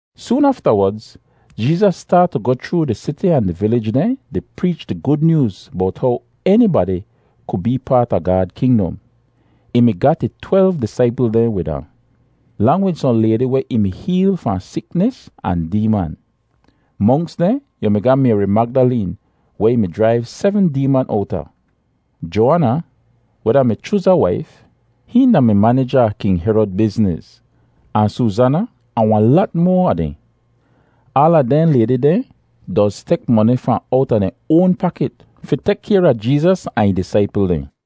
Soon aftawodz Jeezas staat tu goh chroo di siti ahn di vilij dehn di preech di Gud Nyooz bowt how enibadi ku bee paat a Gaad kingdom. Ih mi gat ih twelv disaipl dehn wid ahn, lang wid sohn laydi weh ih mi heel fahn siknis ahn deeman. Monks dehn, yu mi ga Mayri Magdaleen, weh ih mi jraiv sebm deeman owta; Joaana, weh da-mi Chuza waif (hihn da-mi manija a King Herod bizniz); ahn Soozana, ahn wahn lat moa a dehn. Aala dehn laydi deh doz tek moni fahn owta dehn oan pakit fi tek kayr a Jeezas ahn ih disaipl dehn.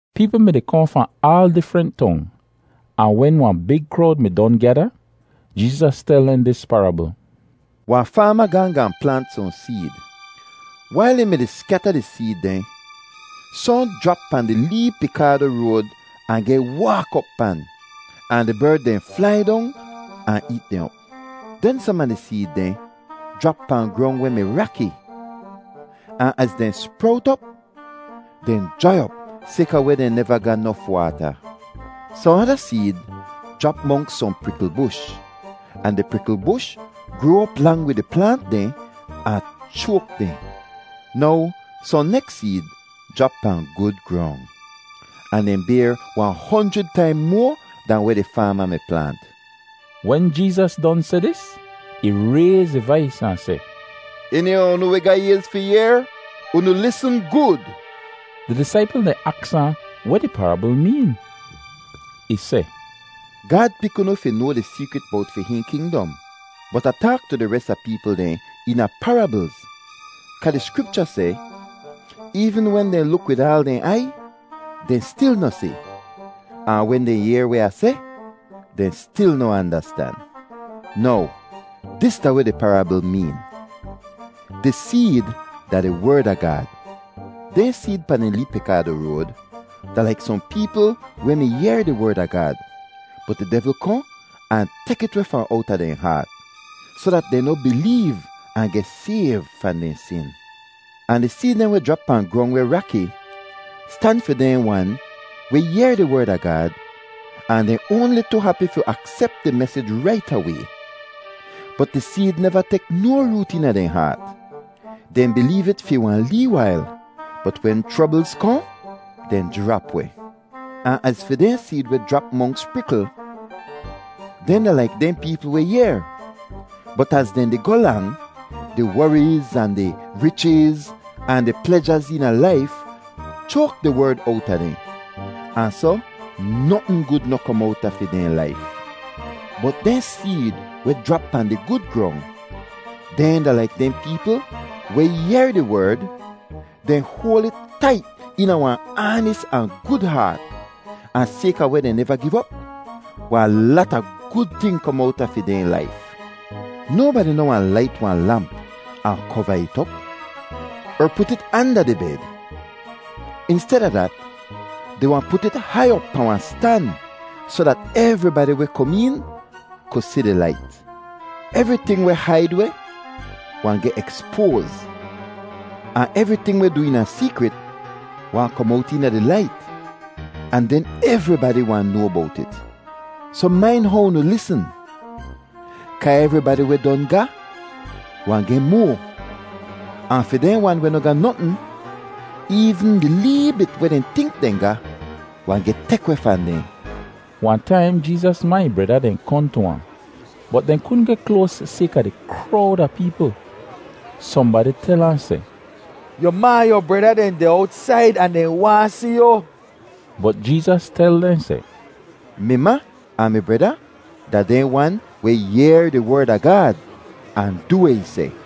Peepl mi-di kohn fahn aal difrent tong, ahn wen wahn big krowd mi don gyada, Jeezas tel dehn dis parabl: “Wahn faama gaahn gaahn plaant sohn seed. Wail ih mi-di skyata di seed dehn, sohn jrap pahn di lee pikaado road ahn geh waak op pan, ahn di berd dehn flai dong ahn eet dehn op. Den som a di seed dehn jrap pahn grong weh mi raki, ahn az dehn sprowt op, dehn jrai op sayka weh dehn neva ga nof waata. Sohn ada seed jrap monks sohn prikl bush, ahn di prikl bush groa op lang wid di plaant dehn ahn choak dehn. Now sohn neks seed jrap pahn gud grong, ahn dehn bayr wahn honjrid taim moa dahn weh di faama mi plaant.” Wen Jeezas don seh dis, ih rayz ih vais ahn seh, “Eni a unu weh ga ayz fi yehr, unu lisn gud!” Di disaipl dehn aks ahn weh di parabl meen. Ih seh, “Gaad pik unu fi noa di seekrit bowt fi hihn kingdom, bot Ah taak tu di res a peepl dehn eena parablz kaa di Skripcha seh, ‘Eevn wen dehn luk wid aal dehn aiy, dehn stil noh si, ahn wen dehn yehr weh Ah seh, dehn stil noh andastan.’ “Now dis da weh di parabl meen: Di seed da di Werd a Gaad. Dehn seed pahn di lee pikaado road da laik sohn peepl weh mi yehr di Werd a Gaad, bot di devl kohn ahn tek it weh fahn owta dehn haat, soh dat dehn noh bileev ahn geh sayv fahn dehn sin. “Ahn di seed dehn weh jrap pahn grong weh raki stan fi dehn wan weh yehr di Werd a Gaad ahn dehn oanli tu hapi fi aksep di mesij rait away; bot di seed neva tek no root eena dehn haat. Dehn bileev it fi wahn lee wail, bot wen chroblz kohn, dehn jrap weh. “Ahn az fi dehn seed weh jrap monks prikl, dehn da laik dehn peepl weh yehr, bot az dehn di goh lang, di woriz, ahn di richiz, ahn di plejaz eena laif choak di Werd owta dehn, ahn soh notn gud noh kom owta fi dehn laif. “Bot dehn seed weh jrap pahn di gud grong, dehn da laik dehn peepl weh yehr di Werd—dehn hoal it tait eena wahn aanis ahn gud haat, ahn sayka weh dehn neva giv op, wahn lata gud ting kom owta fi dehn laif. “Nobadi noh wahn lait wahn lamp ahn kova it op, er put it anda di bed. Insteda dat, dehn wahn put it hai op pahn wahn stan soh dat evribadi weh kom een ku si di lait. Evriting weh haid weh wahn geh ekspoaz, ahn evriting weh du eena seekrit wahn kom owt eena di lait, ahn den evribadi wahn noa bowt it. Soh main how unu lisn kaa evribadi weh don ga wahn geh moa, ahn fi dehn wan weh noh ga notn, eevn di lee bit weh dehn tink dehn ga wahn geh tek weh fahn dehn.” Wahn taim Jeezas ma ahn ih breda dehn kohn tu ahn, bot dehn kudn geh kloas sayka di krowd a peepl. Sohnbadi tel ahn seh, “Yu ma ahn yu breda dehn deh owtsaid ahn dehn waahn si yu.” Bot Jeezas tel dehn seh, “Mi ma ahn mi breda da dehn wan weh yehr di Werd a Gaad ahn du weh ih seh.”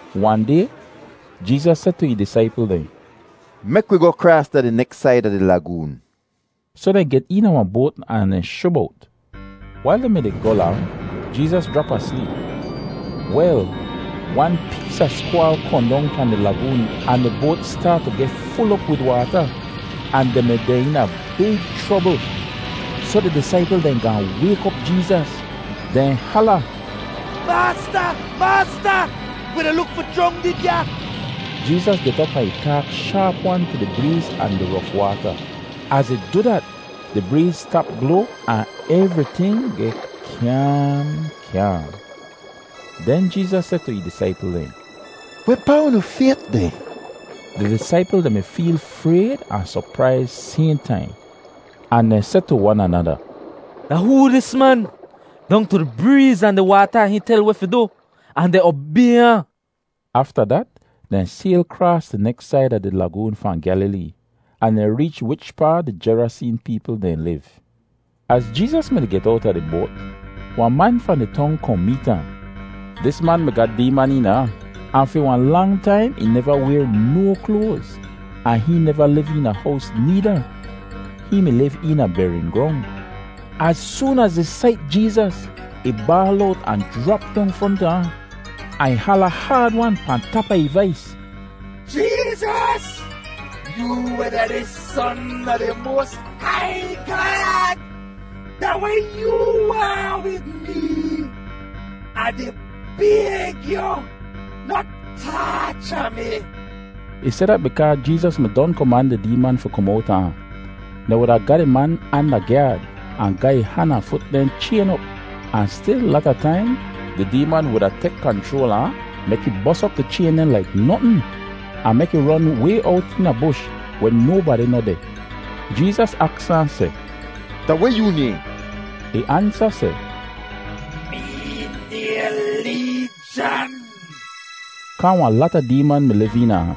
Wahn day Jeezas seh tu ih disaipl dehn, “Mek wi goh kraas da di neks said a di lagoon.” Soh dehn get eena wahn boat ahn dehn shub owt. Wail dehn mi-di goh lang, Jeezas jrap asleep. Wel, wan pees a skwaal kohn dong pahn di lagoon ahn di boat staat tu geh ful op wid waata, ahn dehn mi deh eena big chrobl. Soh di disaipl dehn gaahn wayk op Jeezas. Dehn hala, “Maasta! Maasta! Wi di luk fi jrongdid ya!” Jeezas get op ahn ih taak shaap-wan tu di breez ahn di rof waata. Az ih du dat, di breez stap bloa ahn evriting geh kyaam, kyaam. Den Jeezas seh tu ih disaipl dehn, “Wehpaa unu fayt deh?” Di disaipl dehn mi feel frayd ahn sopraiz sayhn taim, ahn dehn seh tu wan anada, “Da hoo dis man? Dong tu di breez ahn di waata hihn tel weh fi du, ahn dehn obay ahn!” Afta dat dehn sayl kraas di neks said a di lagoon fahn Gyalilee, ahn dehn reech wichpaa di Jeraseen peepl dehn liv. Az Jeezas mi-di get owta di boat, wahn man fahn di tong kohn meet ahn. Dis man mi ga deeman eena ahn, ahn fi wahn lang taim ih neva wayr no kloaz, ahn hihn neva liv eena hows needa; hihn mi liv eena bering grong. Az soon az ih sait Jeezas, ih baal owt ahn jrap dong fronta ahn, ahn ih hala haad-wan pahn tap a ih vais, “Jeezas, yoo weh da di Son a di moas hai Gaad, da weh yoo waahn wid mee? Ah di bayg yu, noh taacha mi.” Ih seh dat bikaa Jeezas mi don koman di deeman fi kom owta ahn. Dehn wuda ga di man anda gyaad ahn ga ih han ahn ih fut dehn chayn op, ahn stil lata taim di deeman wuda tek kanchroal a ahn mek ih bos op di chayn dehn laik notn, ahn mek ih ron way owt eena bush weh nobadi noh deh. Jeezas aks ahn seh, “Da weh yoo nayhn?” Ih ansa seh, “Mee nayhn Leejan,” kaa wahn lata deeman mi liv eena ahn.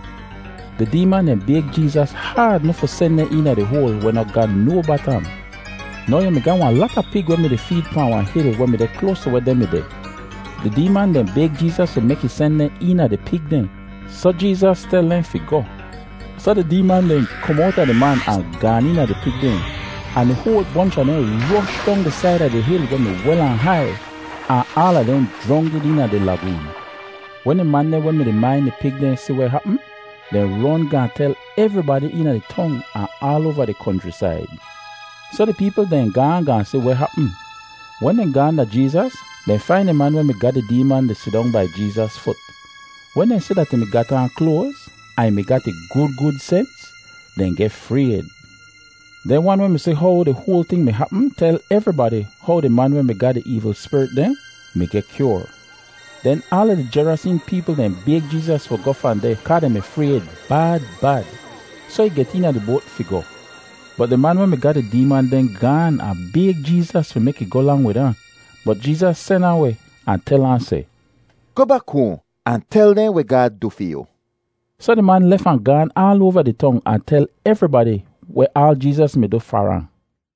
Di deeman dehn bayg Jeezas haad noh fi sen dehn eena di hoal weh noh ga no batam. Now yu mi ga wahn lata pig weh mi-di feed pahn wahn hil weh mi deh kloas tu weh dehn mi deh. Di deeman dehn bayg Jeezas fi mek ih sen dehn eena di pig dehn, soh Jeezas tel dehn fi goh. Soh di deeman dehn kom owta di man ahn gaan eena di pig dehn, ahn di hoal bonch a dehn rosh dong di said a di hil weh mi wel ahn hai, ahn aala dehn jrongdid eena di lagoon. Wen di man dehn weh mi-di main di pig dehn si weh hapm, dehn ron gaahn tel evribadi eena di tong ahn aal oava di konchrisaid. Soh di peepl dehn gaahn gaahn si weh hapm. Wen dehn gaahn da Jeezas, dehn fain di man weh mi ga di deeman di sidong bai Jeezas fut. Wen dehn si dat ih mi gat aan kloaz, ahn ih mi ga ih gud gud sens, dehn geh frayd. Dehn wan weh mi si how di hoal ting mi hapm tel evribadi how di man weh mi ga di eevl spirit dehn mi geh kyoar. Den aala di Jeraseen peepl dehn bayg Jeezas fi goh fahn deh kaa dehn mi frayd bad bad. Soh ih get eena di boat fi goh. Bot di man weh mi ga di deeman dehn gaan ahn bayg Jeezas fi mek ih goh lang wid ahn, bot Jeezas sen ahn weh ahn tel ahn seh, “Goh bak hoahn ahn tel dehn weh Gaad du fi yu.” Soh di man lef ahn gaan aal oava di tong ahn tel evribadi weh aal Jeezas mi du far ahn.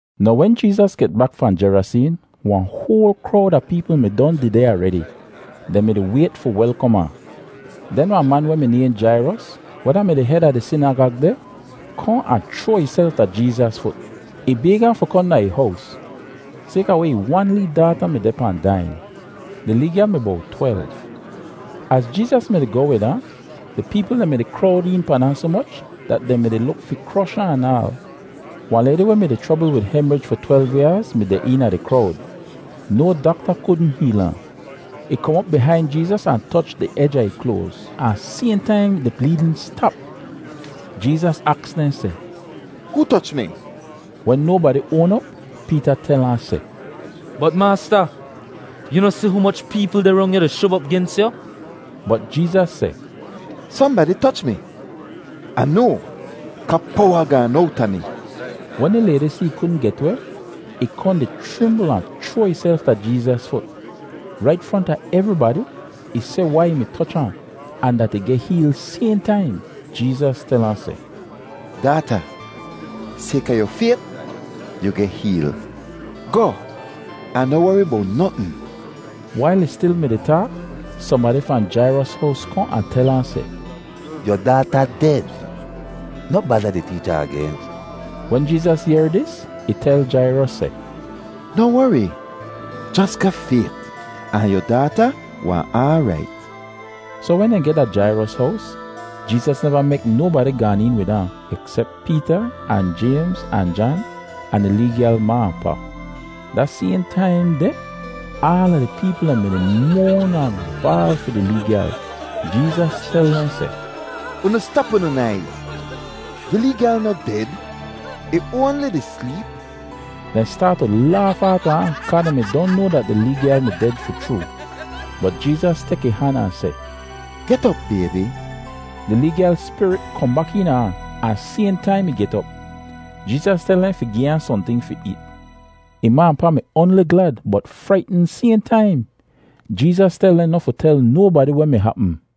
Now wen Jeezas get bak fahn Jeraseen, wahn hoal krowd a peepl mi don dehdeh aredi. Dehn mi-di wayt fi welkom ahn. Den wahn man weh mi nayhn Jairos, weh da-mi di hed a di sinagag deh, kohn ahn chroa ihself da Jeezas fut. Ih bayg ahn fi kohn da ih hows, sayka weh ih wan lee daata mi deh pahn daiyin. Di lee gyal mi bowt twelv. Az Jeezas mi-di goh wid ahn, di peepl dehn mi-di krowd een pan ahn soh moch dat dehn mi-di luk fi krosh ahn anaal. Wahn laydi weh mi-di chrobl wid hemrij fi twelv yaaz mi deh eena di krowd. No dakta kudn heel ahn. Ih kom op bihain Jeezas ahn toch di ej a ih kloaz, ahn sayhn taim di bleedn stap! Jeezas aks dehn seh, “Hoo toch mi?” Wen nobadi oan op, Peeta tel ahn seh, “Bot Maasta, yoo noh si humoch peepl deh rong yu di shub op gens yu?” Bot Jeezas seh, “Sohnbadi toch mi. Ah noa kaa powa gaan owta mi.” Wen di laydi si ih kudn get weh, ih kohn di chrimbl ahn ih chroa ihself da Jeezas fut. Rait fronta evribadi ih seh wai ih mi toch ahn, ahn dat ih geh heel sayhn taim. Jeezas tel ahn seh, “Daata, sayka yu fayt, yu geh heel. Goh, ahn noh wori bowt notn.” Wail ih stil mi-di taak, sohnbadi fahn Jairos hows kohn ahn tel ahn seh, “Yu daata ded. Noh bada di teecha agen.” Wen Jeezas yehr dis, ih tel Jairos seh, “Noh wori, jos ga fayt ahn yu daata wahn aarait.” Soh wen dehn geh da Jairos hows, Jeezas neva mek nobadi gaan een wid ahn, eksep Peeta ahn Jaymz ahn Jan, ahn di lee gyal ma ahn pa. Da sayhn taim deh, aala di peepl dehn mi-di moan ahn baal fi di lee gyal. Jeezas tel dehn seh, “Unu stap unu naiz. Di lee gyal noh ded; ih oanli di sleep!” Dehn staat tu laaf aata ahn kaa dehn mi noa dat di lee gyal mi ded fi chroo. Bot Jeezas tek ih han ahn seh, “Get op, baybi.” Di lee gyal spirit kohn bak eena ahn, ahn sayhn taim ih get op. Jeezas tel dehn fi gi ahn sohnting fi eet. Ih ma ahn pa mi oanli glad bot fraitn sayhn taim! Jeezas tel dehn noh fi tel nobadi weh mi hapm.